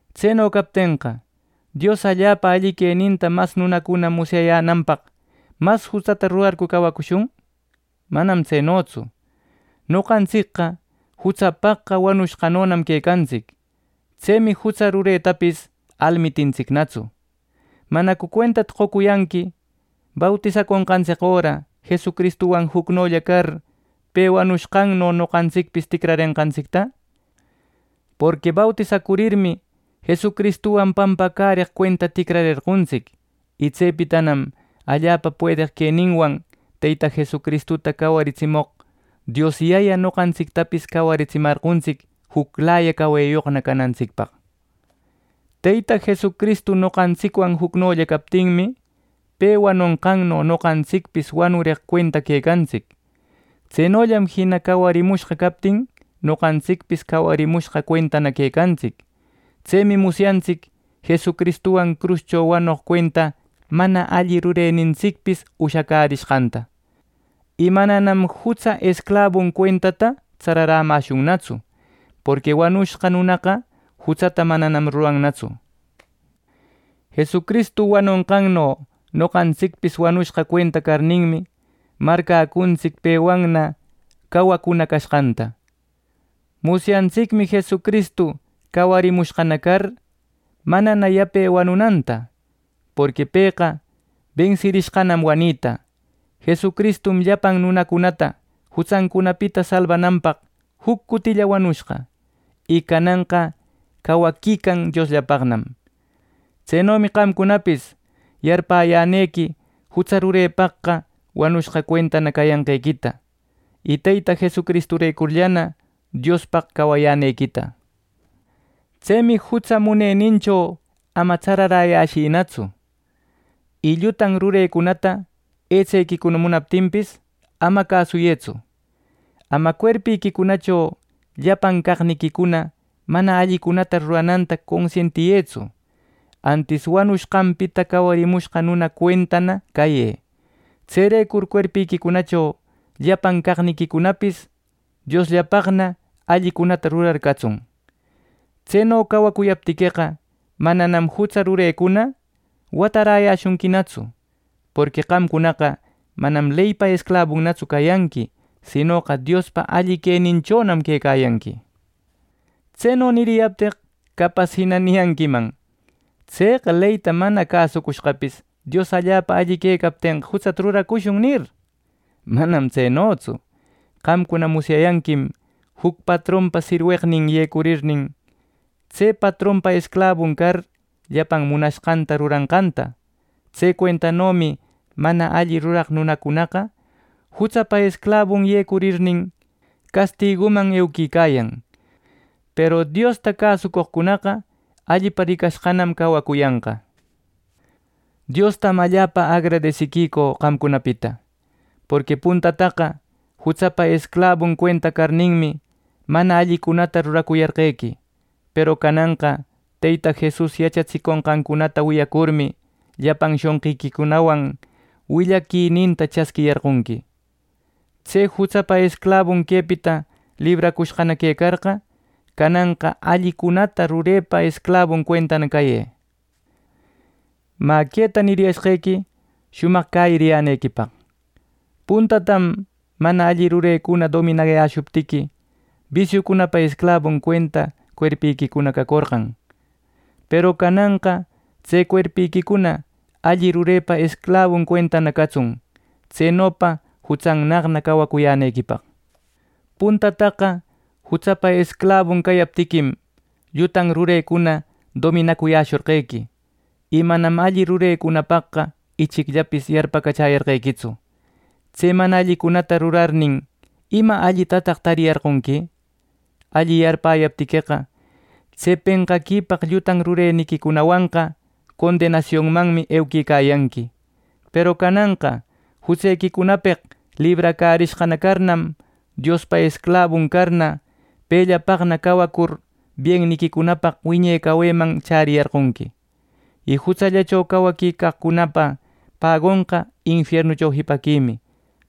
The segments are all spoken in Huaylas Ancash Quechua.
Tseno captenqa, ¿Dios allapa alli queninta mas nunacuna musyananpaq, mas jutsata rurarcu cawacushun! Manam tsenotsu; noqantsicqa jutsapaqqa wanushqanonam quecantsic. Tsemi jutsa ruretapis almitintsicnatsu. ¿Manacu cuentata qocuyanqui bautisaconqantsic öra Jesucristuwan jucnolla car pe wanushqanno noqantsicpis ticrarenqantsicta! Porqui bautisacurmi, Jesucristuwan pampacäreq cuenta ticrarerqontsic. Y tsepitanam allapa puedeq queninwan Teyta Jesusta cawariratsimoq Dios Yaya noqantsictapis cawaritsimarqontsic juclaya caweyoqna canantsicpaq. Teyta Jesucristu noqantsicwan jucnolla captinmi, pe wanonqanno noqantsicpis wanureq cuenta quecantsic. Tsenollam jina cawarimushqa captin noqantsicpis cawarimushqa cuentana quecantsic. Tsemi musyantsic Jesucristuwan cruscho wanoq cuenta mana alli rurenintsicpis ushacärishqanta. Y mananam jutsa esclabun cuentata tsararäcamäshunnatsu. Porqui wanushqa nunaqa jutsata manam rurannatsu. Jesucristu wanonqanno noqantsicpis wanushqa cuenta carninmi, marcäcuntsic pewanna cawacuna cashqanta. Musyantsicmi Jesucristu cawarimushqana car manana yape wanunanta. Porqui pëqa bensirishqanam wanita. Jesucristum llapan nunacunata jutsancunapita salbananpaq juc cutilla wanushqa. Y cananqa cawaquican Diosllapaqnam. Tsenomi qamcunapis yarpäyänequi jutsa rurepaqqa wanushqa cuentana cayanqequita; y Teyta Jesucristurecurllana Diospaq cawayänequita. Tsemi jutsa munenincho ama tsararäcuyäshïtsu. Y llutan rurecunata etsequicuna munapaptinpis, ama cäsuyëtsu. Ama cuerpïquicunacho llapan caqniquicuna mana allicunata rurananta consientiyëtsu; antis wanushqanpita cawarimushqa nuna cuentana cayë. Tserecur cuerpïquicunacho llapan caqniquicunapis Diosllapaqna allicunata rurar catsun. Tseno cawacuyaptiqueqa, mananam jutsa rurecuna wataräyäshunquinatsu. Porqui qamcunaqa manam leypa esclabunatsu cayanqui, sinoqa Diospa alli queninchonam quecayanqui. Tseno niriyapteq capas jina niyanquiman. “Tseqa leyta mana cäsucushqapis, Dios allapa alli quecaptenqa jutsata ruracushun” nir. ¡Manam tsenotsu! Qamcuna musyayanquim juc patronpa sirweqnin yecurnin, tse patronpa esclabun car llapan munashqanta ruranqanta. Tse cuentanomi mana alli ruraq nunacunaqa jutsapa esclabun yecurnin, castiguman euquicayan, peru Diosta cäsucoqcunaqa allipa ricashqanam cawacuyanqa. Diostam allapa agradesiquicü qamcunapita. Porqui puntataqa jutsapa esclabun cuenta carninmi, mana allicunata ruracuyarqequi. Peru cananqa Teyta Jesus yachatsiconqancunata wiyacurmi, llapan shonqiquicunawan willaquininta chasquiyarqonqui. Tse jutsapa esclabun quepita libracushqana quecarqa, cananqa allicuna rurepa esclabun cuentana cayë. Mä, queta niriyashqequi shumaq cäyiriyänequipaq: Puntatam mana alli rurecuna dominayäshuptiqui, bisiupa esclabun cuenta cuerpiquicuna cacorqan; peru cananqa tse cuerpiquicuna alli rurepa esclabun cuentana catsun tsenopa jutsannaqna cawacuyänequipaq. Puntataqa jutsapa esclabun cayaptiquim, llutan rurecuna dominacuyäshorqequi, y manam alli rurecunapaqqa ichicllapis yarpacachäyarqequitsu. Tse mana allicunata rurarnin, ¿ima allitataq tariyarqonqui? Alli yarpäyaptiqueqa, tse penqaquipaq llutan rureniquicunawanqa condenasionmanmi euquicayanqui. Peru cananqa jutsequicunapeq libracärishqana carnam, Diospa esclabun carna, pepaqna cawacur bienniquicunapaq wiñe caweman chäriyarqonqui. Y jutsallacho cawaquicaqcunapa pagonqa infiernucho jipaquimi;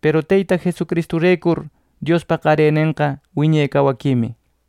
peru Teyta Jesucristurecur Diospa qarenenqa wiñe cawaquimi.